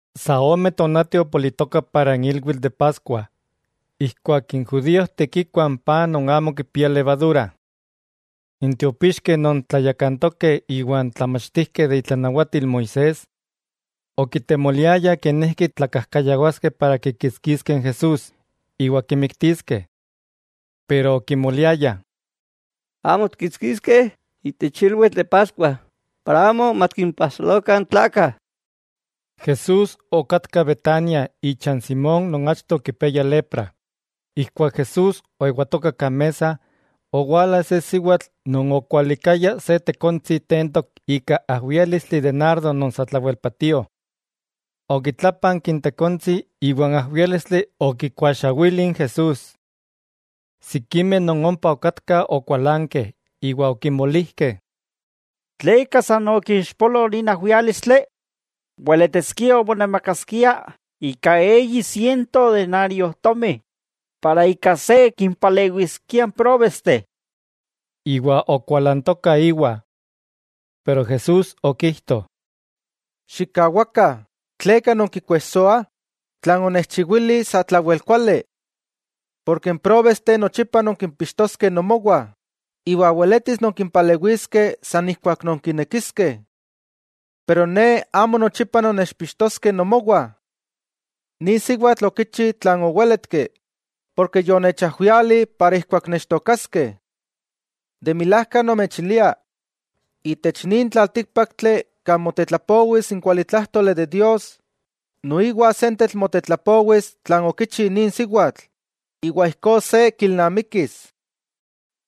Sa ome tonati opolitoka para n ilwitl de Paskua, ijkuak n judíojteh kikuah n paj non amo kipia levadura. N tiopixkeh non tlayakantokeh iwa n tlamachtijkeh de itlanawatil Moisés, okitemoliayah kenijki tlakajkayawaskeh para kikitskiskeh n Jesús iwa kimiktiskeh. Pero okimoliayah: —Amo tikkitskiskeh itech ilwitl de Paskua, para amo matikimpajsolokah n tlakah. Jesús okatka Betania icha n Simón non achto okipiayah lepra. Ijkuak Jesús oewatoka kan mesa, owala se siwatl non okwalikaya se tekontsi tentok ika ajwiálistli de nardo non satlawel patío. Okitlápanki n tekontsi iwa n ajwiálistli okikuaxawili n Jesús. Sikimeh non ompa okatkah okualankeh iwa okimolijkeh: —¿Tleka san okixpolo nin ajwiálistli? Weletiskia monamakaskia ika eyi siento denariojtomi, para ika se kimpalewiskia n próbesteh. Iwa okualantokah íwa. Pero Jesús okijto: —Xikkawakah; ¿tleka nonkikuejsoah? Tlan onechchiwili satlawel kuali. Porke n próbesteh nochipa nonkimpixtoskeh nomowah, iwa weletis nonkimpalewiskeh san ijkuak nonkinekiskeh. Pero Ne amo nochipa nonnechpixtoskeh nomowah. Nin siwatl okichi tlan owéletki, porke yonechajwiali para ijkuak nechtookaskeh. De milajka nomechilia itech nin tlaltíkpaktli kan motetlapowis n kualitlájtoli de Dios, noiwa sentetl motetlapowis tlan okichi nin siwatl, iwa ijkó se kilnamikis.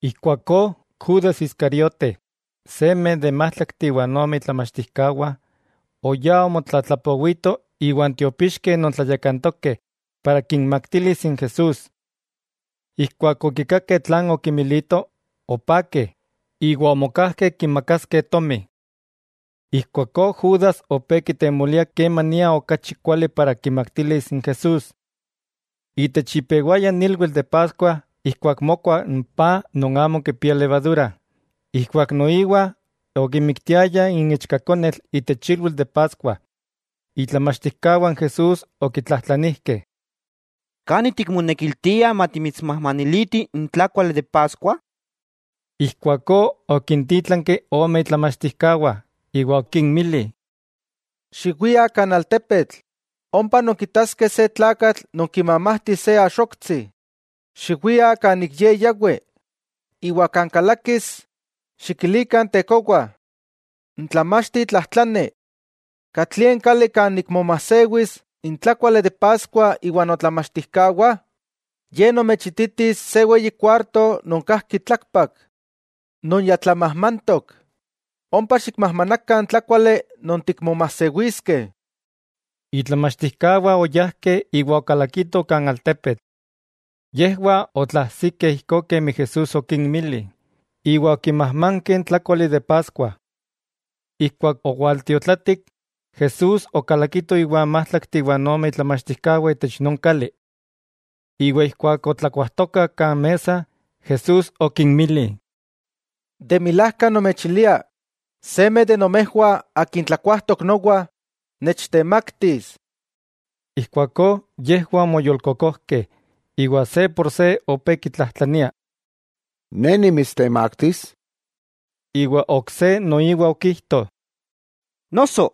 Ijkuakó Judas Iscariote, seme de n májtlakteh iwa ome itlamachtijkawah, oyá omotlatlapowito iwan tiopixkeh non tlayakantokeh para kinmaktilis n Jesús. Ijkuak okikakeh tlan okimilito, opakeh, iwa omokajkeh kimakaskeh tomi. Ijkuakó Judas opé kitemolia kemania okachi kuali para kinmaktilis n Jesús. Itech ipewaya n ilwitl de Paskua ijkuak mokua n paj non amo kipia levadura, ijkuak noiwa okimiktiayah n ichkakonetl itech ilwitl de Paskua, itlamachtijkawah n Jesús okitlajtlanijkeh: —¿Kani tikmonekiltia matimitsmajmanilitih n tlákuali de Paskua? Ijkuakó okintítlanki ome itlamachtijkawah iwa okinmili: —Xiwiah kan altepetl, ompa nonkitaskeh se tlakatl non kimamajti se axoktsi. Xiwiah kan ik ye yawi, iwa kan kalakis, xikilikah n tekowa: “N tlamachti tlajtlani: ¿Katlie n kali kan nikmomajsewis n tlákuali de Paskua iwa notlamachtijkawah?” Ye nomechititis se weyi kuarto non kajki tlakpak. Non ya tlamajmantok. Ompa xikmajmanakah n tlákuali non tikmomajsewiskeh. Itlamachtijkawah oyajkeh iwa okalakitoh kan altepetl. Yejwah otlaajsikeh ijkó kemi Jesús okinmili, iwa okimajmankeh n tlákuali de Paskua. Ijkuak owaltiotlatik, Jesús okalakito iwa n májtlakteh iwa ome itlamachtijkawah itech non kali. Iwa ijkuak otlakuajtokah kan mesa, Jesús okinmili: —De milajka nomechilia non seme, akin tlakuajtok nowa, nechtemaktis. Ijkuakó yejwah omoyolkokojkeh, iwa se por se opé kitlajtlania: —¿Ne nimitstemaktis? Iwa ok se noiwa okijto: —¿Noso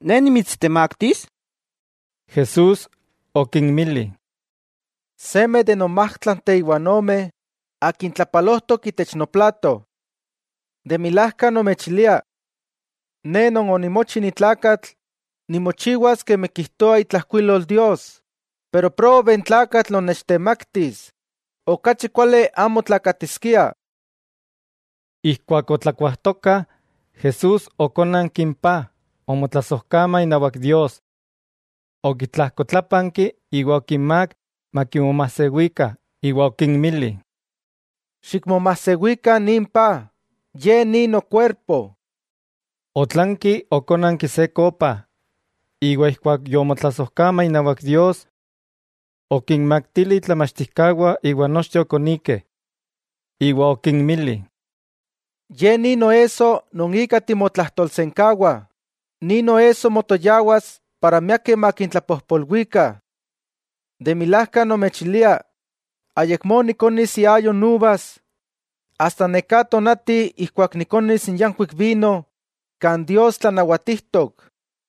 ne nimitstemaktis? Jesús okinmili: —Seme de non májtlakteh iwa n ome, akin tlapalojtok itech noplato. De milajka nomechilia, Ne Non onimochi ni tlakatl nimochiwas kemi kijtoa itlajkuilol Dios, pero ¡probe n tlakatl non nechtemaktis! Okachi kuali amo tlakatiskia. Ijkuak otlakuajtokah, Jesús okónanki n paj, omotlasojkama inawak Dios, okitlajkotlápanki iwa okinmák makimomajsewikah iwa okinmili: —Xikmomasewikah nin paj, ye ni nokuerpo. Otlanki okónanki se kopa, iwa ijkuak yomotlasojkama inawak Dios. Okinmaktili itlamachtijkawah iwa nochteh okonikeh. Iwa okinmili: —Ye ni noesso non ika timotlajtolsenkawa, nin noesso motoyawas para miakeh makintlapojpolwikah. De milajka nomechilia, ayakmó nikonis iayo n uvas, asta neká tonati ijkuak nikonis n yankuik vino kan Dios tlanawatijtok.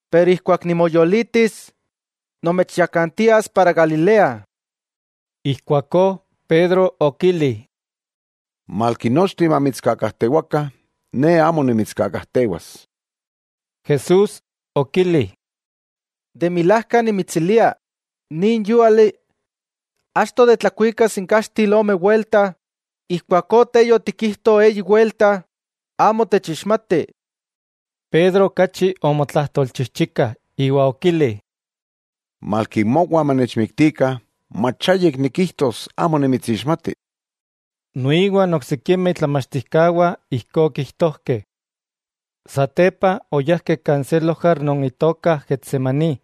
Pero ijkuak nimoyolitis, nomechyakantias para Galilea. Ijkuakó Pedro okili: —Malki nochteh mamitskakajtewakah, ne amo nimitskakajtewas. Jesús okili: —De milajka nimitsilia, nin yúali, achto de tlakuikas n kaxtil ome welta, ijkuakó te yotikijto eyi welta amo techixmati. Pedro okachi omotlajtolchijchika iwa okili: —Malki mowa manechmiktikah, mach ayik nikijtos amo nimitsixmati. Noiwa n oksikimeh itlamachtijkawah ijkó okijtojkeh. Satepa oyajkeh kan se lojar non itoka Getsemaní,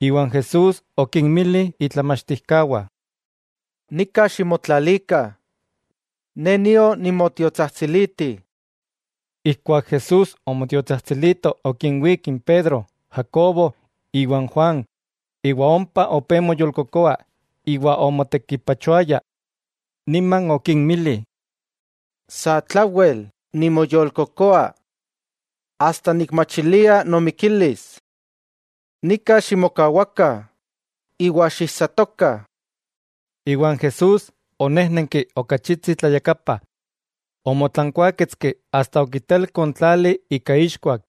iwa n Jesús okinmili itlamachtijkawah: —Nika ximotlalikah, Ne nio nimotiotsajtsiliti. Ijkuak Jesús omotiotsajtsilito okinwík n Pedro, Jacobo iwa n Juan, iwa ompa opé moyolkokoa iwa omotekipachoaya. Niman okinmili: —Satlawel nimoyolkokoa, asta nikmachilia nomikilis. Nika ximokawakah iwa xiijsatokah. Iwa n Jesús onéjnenki okachitsi tlayakapa, omotlankuáketski asta okitelko n tlali ika ixkuak,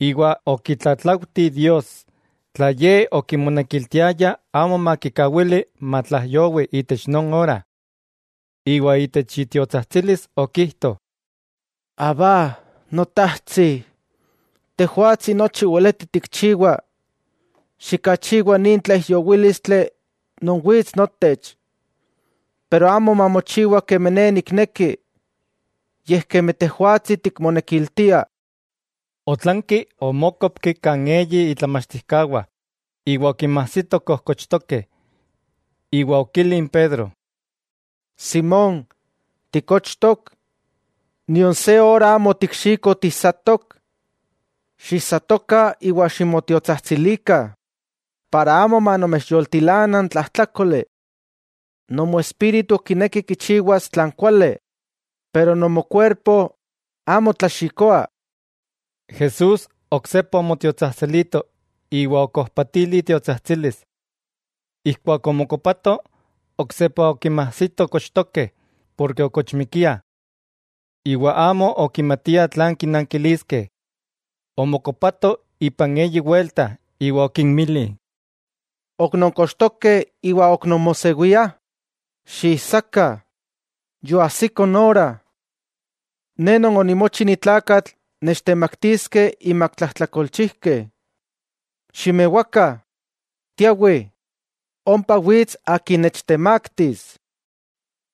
iwa okitlatlaujti Dios, tla Ye okimonekiltiaya amo makikawili matlaijyowi itech non ora. Iwa itech itiotsajtsilis okijto: —Abba, Notajtsi, Tejwatsi nochi weleti tikchiwa; xikachiwa nin tlaijyowílistli non wits notech, pero amo mamochiwa kemi Ne nikneki, yej kemi Tejwatsi tikmonekiltia. Otlanki omókopki kan eyi itlamachtijkawah iwa okinmajsito kojkochtokeh, iwa okili n Pedro: —Simón, ¿tikochtok? ¿Nion se ora amo otikxiko tiijsatok? Xijsatokah iwa ximotiotsajtsilikah, para amo manomechyoltilana n tlajtlákoli. Nomoespíritu kineki kichiwas tlan kuali, pero nomokuerpo amo tlaxikoa. Jesús oksepa omotiotsajtsilito iwa okojpatili itiotsajtsilis. Ijkuak omokopato, oksepa okinmajsito kochtokeh, porke okochmikiah. Iwa amo okimatiah tlan kinankiliskeh. Omokopato ipan eyi welta iwa okinmili: —¿Ok non kochtokeh iwa ok nonmosewiah? ¡Xiijsakah! Yoajsiko n ora, Ne Non onimochi ni tlakatl nechtemaktiskeh inmak tlajtlakolchijkeh. ¡Ximewakah, tiawih! Ompa wits akin nechtemaktis.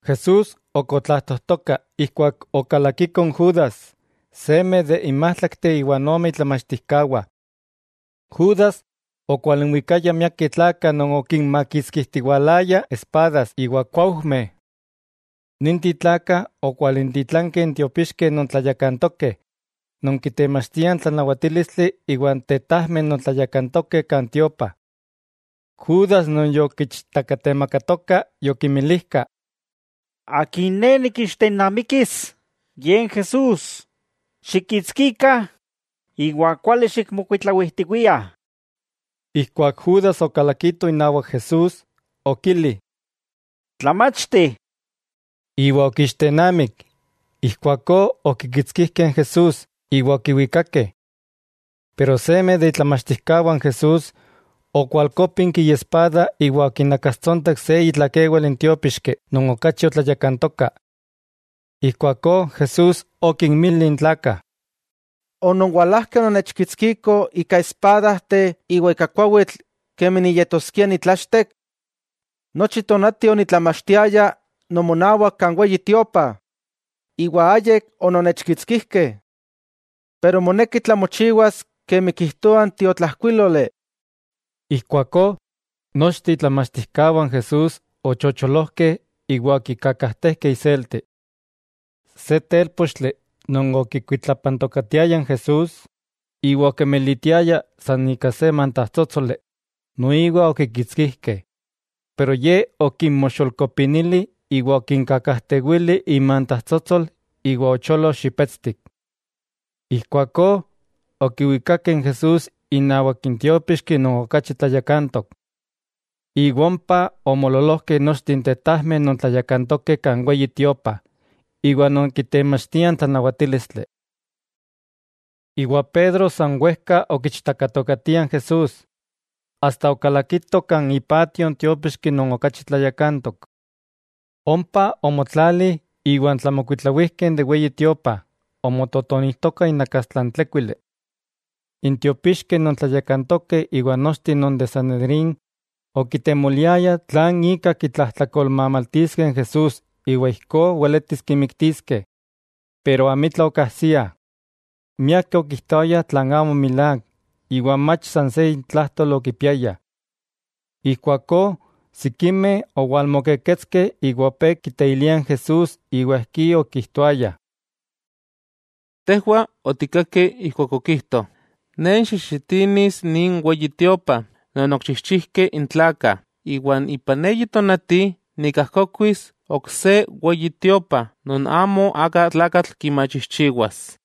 Jesús ok otlajtojtoka ijkuak okalakiko n Judas, seme de n májtlakteh iwa ome itlamachtijkawah. Judas okwalinwikaya miakeh tlakah non okinmakitskijtiwalayah espadas iwa kuaujmeh. Ninteh tlakah okwalintitlankeh n tiopixkeh non tlayakantokeh, non kitemachtiah n tlanawatílistli iwa n tetajmeh non tlayakantokeh kan tiopa. Judas non yokiichtakatemakatoka yokinmilijka: —Akin ne nikixtennamikis, ye n Jesús, xikkitskikah iwa kuali xikmokuitlawijtiwiah. Ijkuak Judas okalakito inawak Jesús, okili: —Tlamachti. Iwa okiixtennamik. Ijkuakó okikitskijkeh n Jesús, iwa okiwikakeh. Pero seme de itlamachtijkawah n Jesús, okualkópinki iespada iwa okinakastsontek se itlakewal n tiópixki non okachi otlayakantoka. Ijkuakó Jesús okinmili n tlakah: —¿Ononwalajkeh ononnechkitskikoh ika espadajteh iwa ika kuawitl kemi niyetoskia nitlachtek? Nochi tonati onitlamachtiaya nomonawak kan Weyi Tiopa, iwa ayik ononnechkitskijkeh. Pero moneki tlamochiwas kemi kijtoah n tiotlajkuíloli. Ijkuakó nochteh itlamachtijkawah n Jesús ochocholojkeh iwa okikakajtejkeh iselti. Se télpochtli non okikuitlapantokatiaya n Jesús iwa okemelitiaya san ika se mantajtsótsoli, noiwa okikitskijkeh, pero ye okinmoxolkopinili iwa okinkakajtewili imantajtsótsol iwa ocholo xipetstik. Ijkuakó okiwikakeh n Jesús inawak n tiópixki non okachi tlayakantok. Iwa ompa omoololojkeh nochteh n tetajmeh non tlayakantokeh kan Weyi Tiopa, iwa non kitemachtiah n tlanawatílistli. Iwa Pedro san wejka okiichtakatokatia n Jesús asta okalakito kan ipatio n tiópixki non okachi tlayakantok. Ompa omotlali iwan tlamokuitlawijkeh de n Weyi Tiopa, omototonijtokah inakastla n tlékuili. N tiopixkeh non tlayakantokeh iwa n nochteh non de n Sanedrín okitemoliayah tlan ika kitlajtlakolmamaltiskeh n Jesús iwa ijkó weletis kimiktiskeh. Pero amitla okajsiah. Miakeh okijtoayah tlan amo milák, iwa mach san se intlajtol okipiayah. Ijkuakó sikimeh owalmokeketskeh iwa opé kiteiliah n Jesús iwa ijkí okijtoayah: —Tejwah otikkakeh ijkuak okijto: “Ne nikxixinis nin Weyi Tiopa non okichijchijkeh n tlakah, iwa ipan eyi tonati nikajkokuis ok se Weyi Tiopa non amo aka tlakatl kimachijchiwas.”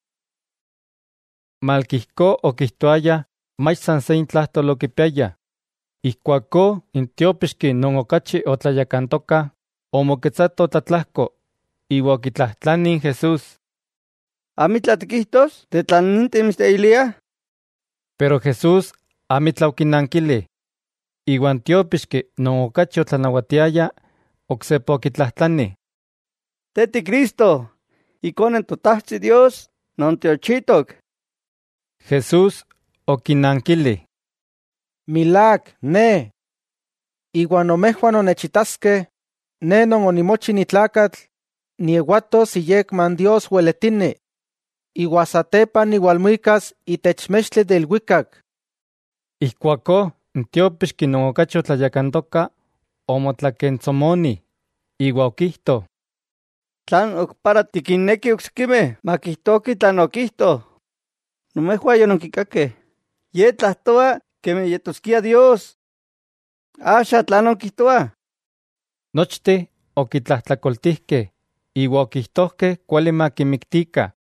Malki ijkó okijtoayah mach san se intlajtol okipiayah. Ijkuakó n tiópixki non okachi otlayakantoka omoketsato tlatlajko iwa okitlajtlani n Jesús: —¿Amitla tikijtos de tlan ninteh mitsteiliah? Jesús amitla okinankili. Iwa n tiópixki non okachi otlanawatiaya oksepa okitlajtlani: —¿Te ti Cristo, Ikone n Totajtsi Dios Non tiochitok? Jesús okinankili: —Milák, Ne. Iwa nomejwah nonnechitaskeh Ne non onimochi ni tlakatl niewatos iyekma n Dios weletini, iwa satepa niwalmuikas itech mextli de ilwikak. Ijkuakó n tiópixki non okachi otlayakantoka omotlakentsomoni iwa okijto: —¿Tlan ok para tikinnekih oksikimeh makijtokih tlan okijto? ¡Nomejwah yononkikakeh, Ye tlajtoa kemi yetoskia Dios! ¿Axa, tlan nonkijtoah? Nochteh okitlajtlakoltijkeh iwa okijtojkeh kuali makimiktikah.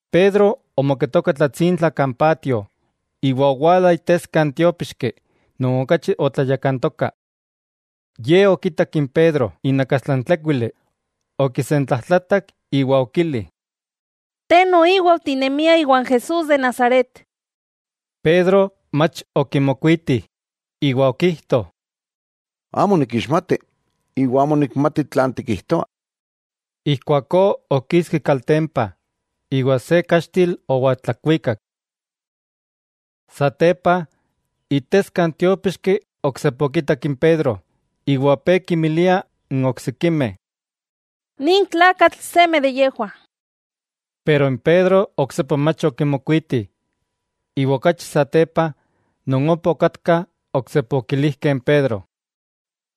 Pedro omoketoka tlatsintla kan patio, iwa owala iteska n tiópixki non okachi otlayakantoka. Ye okitak n Pedro inakastla n tlékuili, okisentlajtlatak iwa okili: —Te noiwa otinemia iwan Jesús de Nazaret. Pedro mach okimokuiti iwa okijto: —Amo nikixmati, iwa amo nikmati tlan tikijtoa. Ijkuakó okiski kaltempa, iwa se kaxtil owaltlakuikak. Satepa, iteska n tiópixki oksepa okitak n Pedro iwa opé kinmilia n oksikimeh: —Nin tlakatl seme de yejwah. Pero n Pedro oksepa mach okimokuiti. Iwa okachi satepa, non ompa okatkah oksepa okilijkeh n Pedro: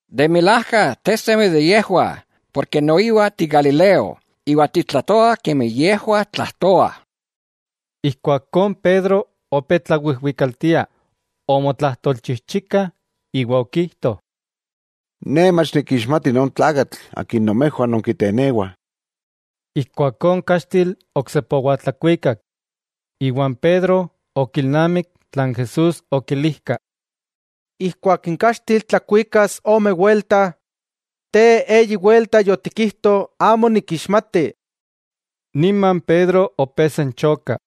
—De milajka te seme de yejwah, porke noiwa ti galileo, iwa titlajtoa kemi yejwah tlajtoah. Ijkuakó n Pedro opé tlawijwikaltia, omotlajtolchijchika iwa okijto: —¡Ne mach nikixmati non tlakatl akin nomejwah nonkitenewah! Ijkuakó n kaxtil oksepa owaltlakuikak, iwa n Pedro okilnamik tlan Jesús okilijka: “Ijkuak n kaxtil tlakuikas ome welta; te eyi welta yotikijto amo nikixmati.” Nima n Pedro opé senchoka.